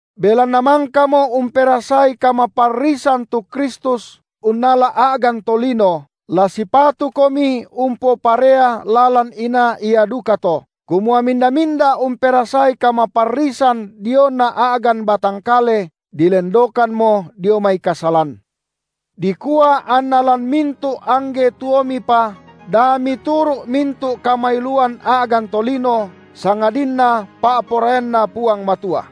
Belanna mangkamo umperasai kamaparrisan tu Kristus unnala a’gan tolino, la sipatukomi umpoparea lalan inaa ia dukato, kumua minda-minda umperasai kamaparrisan diona a’gan batang kale, dilendokammo dio mai kasalan, dikua anna lan mintu’ angge tuomipa, da mituru’ mintu’ kamailuan a’gan tolino, sangadinna pa’poraianNa Puang Matua.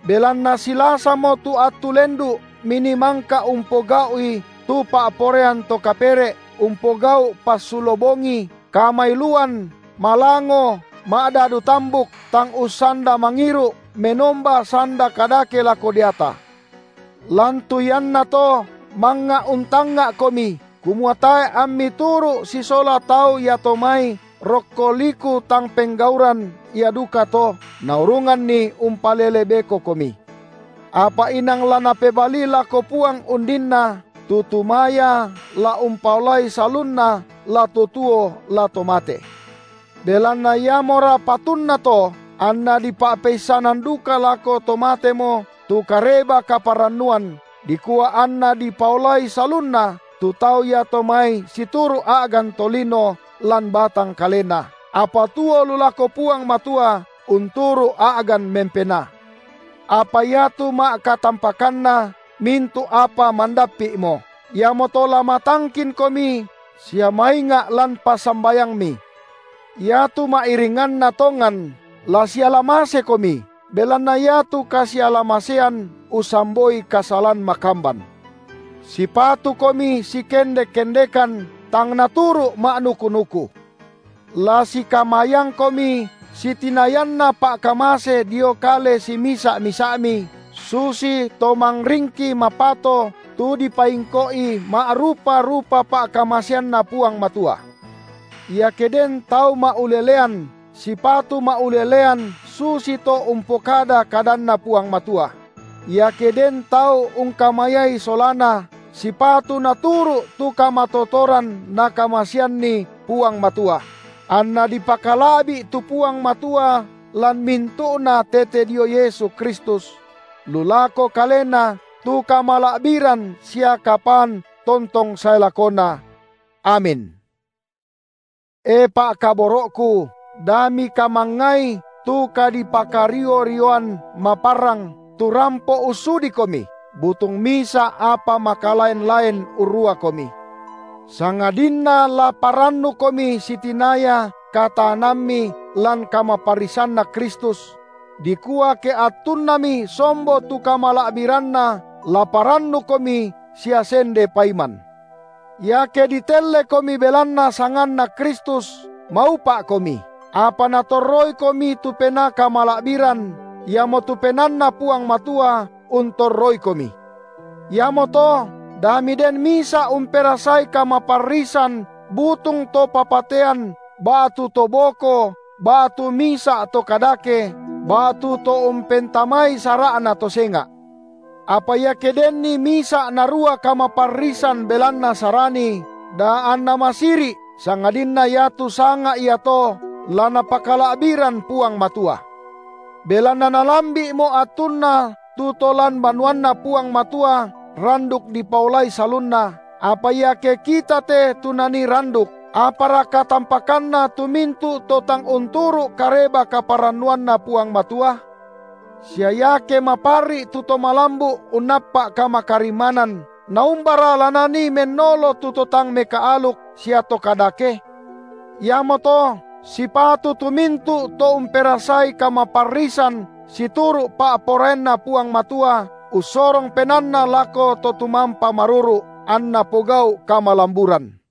Belanna silasamo tu attu lendu’ minii mangka umpogau’i tu pa’poraian to kapere’, umpogau’ passulo bongi, kamailuan, malango, ma’dadu tambuk, tang ussanda mangiru’, menomba sanda kadake lako deata. Lan tu iannato mangnga untangnga’komi, kumua tae’ ammi turu’ sisola tau iato mai rokko liku tang penggauran ia dukato, naurunganni umpalele bekokomi; apa inang la napebalii lako Puang undinna, tu tumaya la umpaolai salunna la to tuo la to mate. Belanna iamora patunna to anna dipa’peissanan duka lako to matemo tu Kareba-kaparannuan, dikua anna dipaolai salunna tu tau iato mai situru’ a’gan tolino lan batang kalena, apa tuo lu lako Puang Matua unturu’ a’gan mempenaa. Apa iatu ma’katampakanna mintu’ apa mandappi’mo, iamoto la matangkinkomi sia mainga’ lan passambayangmi. Iatu ma’iringanna tongan la siala masekomi, belanna iatu kasiala-masean ussamboi kasalan makamban. Sipatukomi sikendek-kendekan tang naturu’ ma’nuku-nuku. La sikamayangkomi sitinayanna pa’kamase dio kale simisa’-misa’mi, susito mangringki mapato tu dipaingko’i ma’rupa-rupa pa’kamaseanNa Puang Matua. Iake den tau ma’ulelean, sipatu ma’ulelean susito umpokada kadanNa Puang Matua; iake den tau ungkamayai solana, sipatu naturu’ tu kamatotoran Nakamaseanni Puang Matua; anna dipakala’bi’ tu Puang Matua lan mintu’na tete dio Yesu Kristus; lu lako Kalena tu kamala’biran sia kapaan tontong sae lakona. Amin. E pa’kaboro’ku, da mikamangngai tu kadipakario-rioan maparrang tu rampo ussudikomi, butung misa’ apa makalaen-laen urruakomi, sangadinna la parannukomi sitinaya kataanammi lan kamaparrisanNa Kristus; dikua ke attunnami sombo tu kamala’biranNa la parannukomi sia sende paiman. Iake ditellekomi belanna sanganNa Kristus, maupa’komi, apa Natorroikomi tu Penaa kamala’biran, iamotu PenaanNa Puang Matua untorroikomi. Iamoto, da miden misa’ umperasai kamaparrisan butung to papatean ba’tu to boko ba’tu misa’ to kadake, ba’tu to umpentamai sara’na to senga’; apa iake denni misa’ narua kamaparrisan belanna Sarani, da anna masiri’, sangadinna iatu sanga iato la napakala’biran Puang Matua. Belanna nalambi’mo attunna tu to lan banuanNa Puang Matua randuk dipaolai salunna, apa iake kita te tu nanii randuk, apara katampakanna tu mintu’ to tang unturu’ Kareba-kaparannuanNa Puang Matua? Sia iake maparri’i tu to malambu’ unnappa’ kamakarimmanan, naumbara la nanii mennolo tu to tang mekaaluk sia to kadake? Iamoto sipatu tu mintu’ to umperasai kamaparrisan situru’ pa’poraianNa Puang Matua ussorong penaanna lako To tumampa maruru’, anna pogau’ kamalamburan.